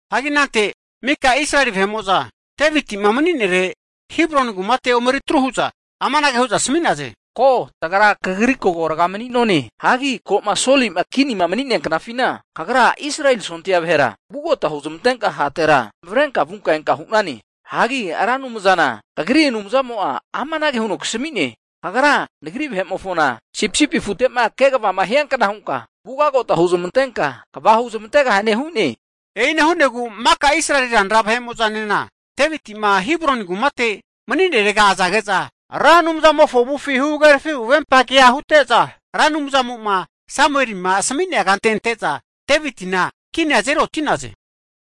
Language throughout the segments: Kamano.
Hagi anante mika Israeli vahe'mo'za Deviti'ma mani'nere Hebroni kumate omeri tru hu'za amanage hu'za asami'naze, ko tagra kagri kora mani'none. Hagi koma Soli'ma kinima mani'nea knafina kagra Israeli sondia vahera vugota huzamantenka hatera zamavarenka vunka enka hu'nane. Hagi Ra Anumzana kagri Anumzamo'a amanage huno kasami'ne, kagra Nagri vahe'mofona sipisipi afute'ma kegavama hiankna hunka ugagota huzmantenka kva huzmantegahane hu'ne. E'ina hu'negu maka Israeli ranara vahe'mo'zanena Deviti'ma Hebroni kumate mani'nerega azage'za, Ra Anumzamofo avufi huhagerafi huvempa kea hute'za, Ra Anumzamo'ma Samuelima asami'nea kante ante'za Devitina kinia azeri oti'naze.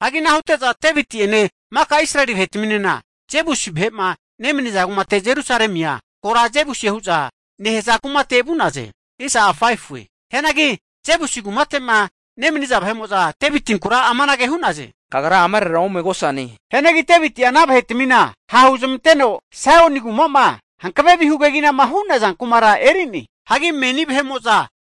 Hagi ana hute'za Deviti'ene maka Israeli vahe'mo'za Jebusi vahe'ma nemaniza kumate Jerusalemia kora Jebusie hu'za nehaza kumate vu'naze. Hianagi Jebusi kumate'ma nemaniza vahe'mo'za Devitinkura amanage hu'naze, kagra amarera omegosane. Hianagi Deviti'a ana vahetamina ha' huzmanteno Saioni kuma'ma hankave vihu keginama hu'naza kumara eri'ne. Hagi meni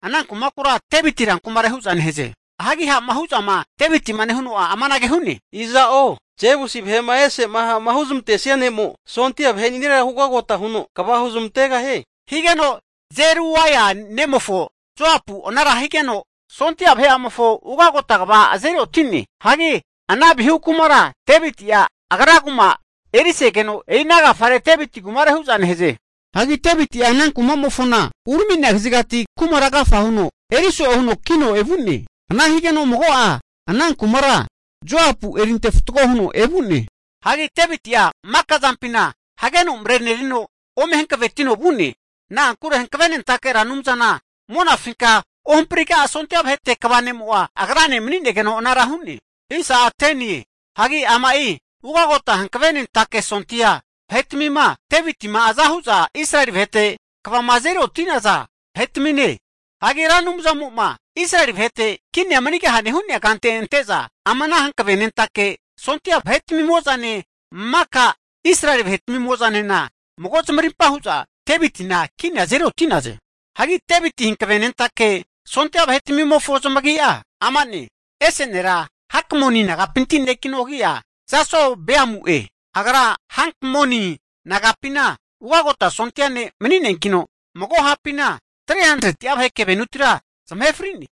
ana kumakura Deviti rankumare hu'za nehaze. Hagi ha'ma hu'zama Devitima nehuno'a amanage hu'ne, iza'o Jebusi vahe'ma ese'ma ha'ma huzmantesia ne'mo sondia vahe'niarera ugagota huno kva huzmantegahie, higeno Zeruaia nemofo Joapu anara higeno, Sondia vahe'amofo ugagota kva azeri oti'ne. Hagi ana vihu kumara Deviti'a agra kuma erisegeno, e'i ana agafare Deviti rankumare hu'za nehaze. Hagi Deviti'a ana kumamofona urami'nea kazigati kumara agafa huno eri so'e huno ki'no evu'ne. Ana higeno mago'a ana kumara Joapu eri ante fatgo huno evu'ne. Hagi Deviti'a maka zampina hageno marenerino ome hankavetino vu'ne. Na'ankure Hanavenentake Ra Anumzana Monafinka Ohampriga Sondia Vahete kva nemo'a agrane mani'negeno anara hu'ne. Hagi ama'i ugagota hu'za hankavenentake sondia vahetamima Deviti'ma aza hu'za Israeli vahete kvama azeri oti'naza vahetamine. Hagi Ra Anumzamo'ma Israeli vahete kini manigahie hu'nea kante ante'za ama ana hankavenentake sondia vahetmimo'zane maka Israeli vahe'mo'zanena mago zamarimpa hu'za Devitina kinia azeri oti'naze. Hagi Devitina hankavenentake sondia vahetmimofo zamagi'a amane, ese nera Hakmoni nagapinti nekino agi'a Jasobeamu'e. Agra Hankmoni nagapina ugagota sondia ne' mani'neankino, mago hapina 300'a vahe kevenutira zamahe fri'ne.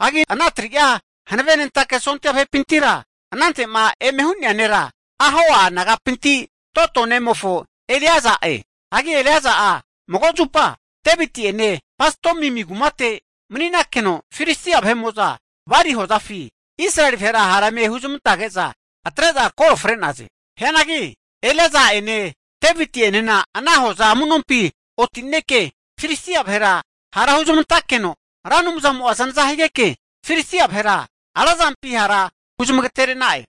Hagi ana 3'a hanavenentake sondia vahepintira anante'ma eme hu'nea nera Ahoa nagapinti Dodo nemofo Eleaza'e. Hagi Eleaza'a mago zupa Deviti'ene Pas-damimi kumate mani'nakeno Filistia vahe'mo'za bali hozafi Israeli vahera hara eme huzmantege'za atre'za kore fre'naze. Hianagi Eleaza'ene Deviti'enena ana hoza amunompi oti'neke Filistia vahera hara hunezamantakeno Ra Anumzamo'a zanaza higeke Filistia vahera razampi hara huzamagatere'na'e.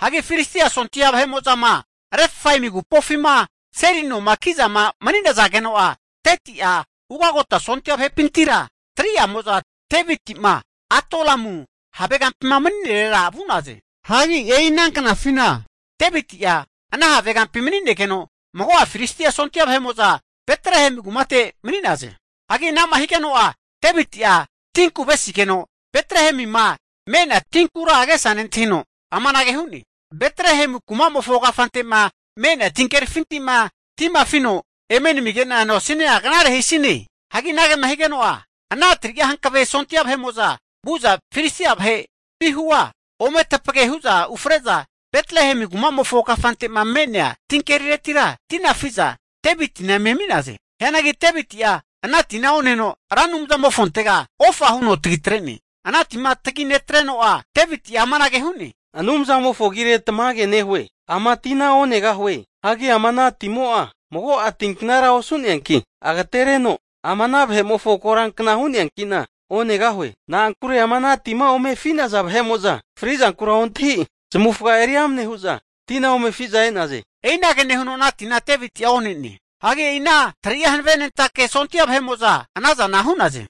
Hagi Filistia sondia vahe'mo'zama Refaimi agupofima seli noma ki'zama mani'nazageno'a, 30'a ugagota sondia vahepintira 3'amo'za Deviti'ma Adulamu havegampima mani'nerega vu'naze. Hagi e'i ana knafina Deviti'a ana havegampi mani'negeno, mago'a Filistia sondia vahe'mo'za Betlehemi kumate mani'na'ze. Hagi anama higeno'a Deviti'a tinku avesigeno Betlehemima me'nea tinkura agesa nentahino amanage hu'ne, Betlehemi kumamofo kafante'ma me'nea tinkerifintima tima afino eme namige'na noasina knare hisine. Hagi anagema higeno'a, ana 3'a hankave sondia vahe'mo'za vu'za Filistia vahe vihua ome tapage hu'za ufre'za Betlehemi kumamofo kafante'ma me'nea tinkeriretira tina afi'za Devitina eme ami'naze. Hianagi Deviti'a ana tina oneno Ra Anumzamofontega ofa huno tagitre'ne. Ana tima taginetreno'a Deviti amanage hu'ne, Anumzamofo agire tamage nehue, ama'i tina onegahue. Hagi ama ana timo'a mago'a tinknara osu'neanki agatereno, ama ana vahe'mofo korankna hu'neanki'na onegahue. Na'ankure ama ana tima ome afi'naza vahe'mo'za fri'zankura ontahi zamavufaga eri amne hu'za tina ome afi'za e'naze. E'inage nehuno ana tina Deviti'a one'ne. Hagi e'i ana 3'a hanavenentake sondia vahe'mo'za ana zana hu'naze.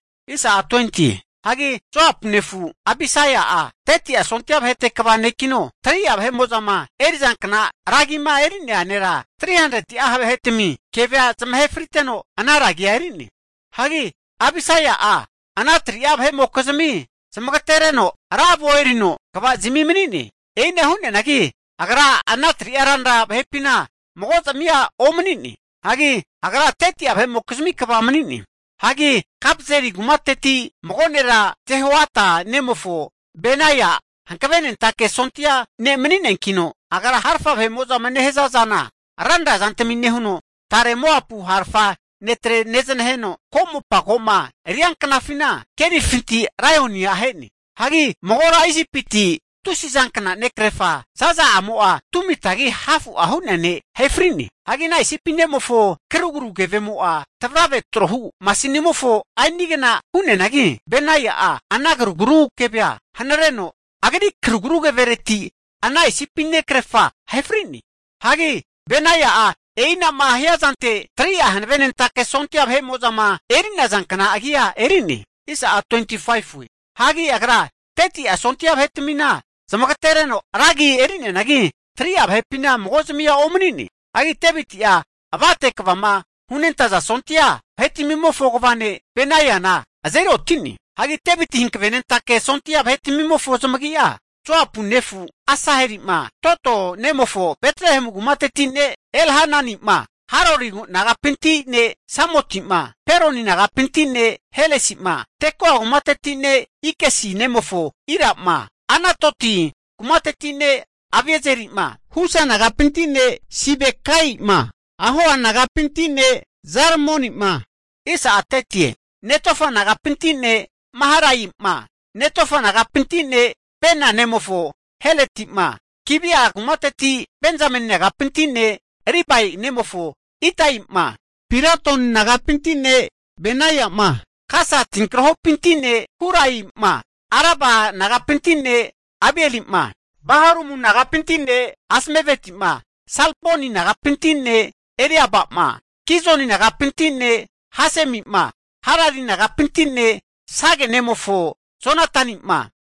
Hagi Joapu nefu Abisai'a 30'a sondia vahete kva nekino, 3'a vahe'mo'zama eri'zankna ra agima eri'nea nera, 300'a ha' vahetami kevea zamahe friteno, ana ra agia eri'ne. Hagi Abisai'a ana 3'a vahe'mokizimia zamagetereno ra avo erino, kvazimi mani'ne. E'ina hu'neanagi, agra ana 3'a ranra vahepina mago'zamia omani'ne. Hagi agra 30'a vahe'mokizmi kva mani'ne. Hagi Kapzeli kumateti mago nera Johoiada nemofo Benaia'a hankavenentake sondia ne' mani'neankino, agra harafa vahe'mo'zama nehaza zana ranra zantmi nehuno, tare Moapu harafa netrena neznaheno, ko'mopa ko'ma rianknafina kerifintira laionia ahe'ne. Hagi magora Isipiti tusizankna nekrefa zaza'amo'a 2mitagi hafu hu'nea ne' ahe fri'ne. Hagi ana Isipi ne'mofo karugru keve'amo'a tavrave trohu masinimofo aini'agna hu'neanagi, Benaia'a ana karugru keve'a hanareno, agri karugru kevereti ana Isipi nekrefa arefri'ne. Hagi Benaia'a e'inama hiazante 3'a hanavenentake sondia vahe'mo'zama eri'nazankna agia eri'ne. Hagi agra 30'a sondia vahe'tmina zamagatereno ra agi eri'neanagi, 3'a vahepina mago'zamia omani'ne. Hagi Deviti'a avate kvama hunentaza sondia vahetmimofo kva ne' Beniana azeri oti'ne. Hagi Devitina hankavenentake sondia vahetmimofo zamagi'a, Joapu nefu Asaheli'ma, Dodo nemofo Betlehemu kumateti ne' Elhanani'ma, Harori nagapinti ne' Samoti'ma, Peloni nagapinti ne' Helesi'ma, Tekoa kumateti ne' Ikesi nemofo Ira'ma, Anatoti kumateti ne' Aviezeri'ma, Husa nagapinti ne' Sibekai'ma, Ahoa nagapinti ne' Zalmoni'ma, Netofa nagapinti ne' Maharai'ma, Netofa nagapinti ne' Bana ne'mofo Heledi'ma, Gibea kumateti, Benzameni nagapinti ne' Ribai nemofo Itai'ma, Piratoni nagapinti ne' Benaia'ma, Gasa tinkrahopinti ne' Hurai'ma, Araba nagapinti ne' Abieli'ma, Baharumu nagapinti ne' Azmaveti'ma, Salboni nagapinti ne' Eliaba'ma, Gizoni nagapinti ne' Hasemi'ma, Harari nagapinti ne' Sage nemofo Jonatani'ma,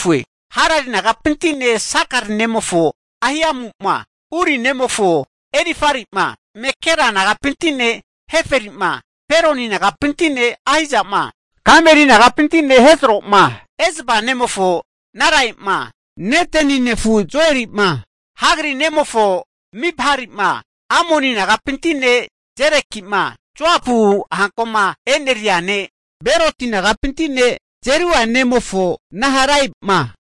Harari nagapinti ne' Sakari nemofo Ahiamu'ma, Uri nemofo Elifari'ma Mekera nagapinti ne' Heferi'ma, Peloni nagapinti ne' Ahizama, Kameri nagapinti ne' Hezro'ma, Ezbai nemofo Narai'ma, Neteni nefu Joeli'ma, Hagri nemofo Mibhari'ma, Amoni nagapinti ne' Zeleki'ma, Joapu hankoma e'neria ne' Beroti nagapinti ne' Zeruia nemofo Naharai'ma,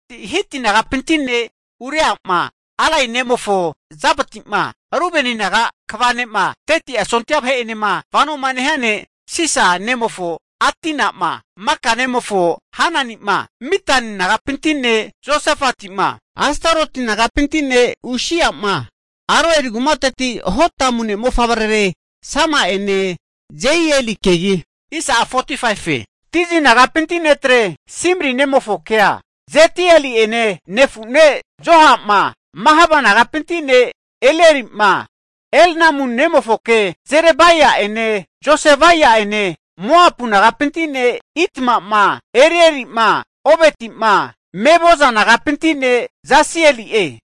Hiti nagapinti ne' Uria'ma, Alai nemofo Zabati'ma, Rubeni naga kva ne'ma 30'a sondia vahe'enema vanoma nehia ne' Siza nemofo Adina'ma, Maka nemofo Hanani'ma, Mitan nagapinti ne' Josafati'ma, Astaroti nagapinti ne' Usia'ma, Aroeli kumateti Hotamu ne' mofavrerare Sama'ene Jeielikegi, Tizi nagapinti netre Simri nemofokea Jediaeli'ene nefu ne' Joha'ma, Mahava nagapinti ne' Elieli'ma, Elnamu nemofoke Jeribai'ene Josavia'ene, Moapu nagapinti ne' Itma'ma, Erieli'ma, Obeti'ma, Mezoba nagapinti ne' Jasieli'e.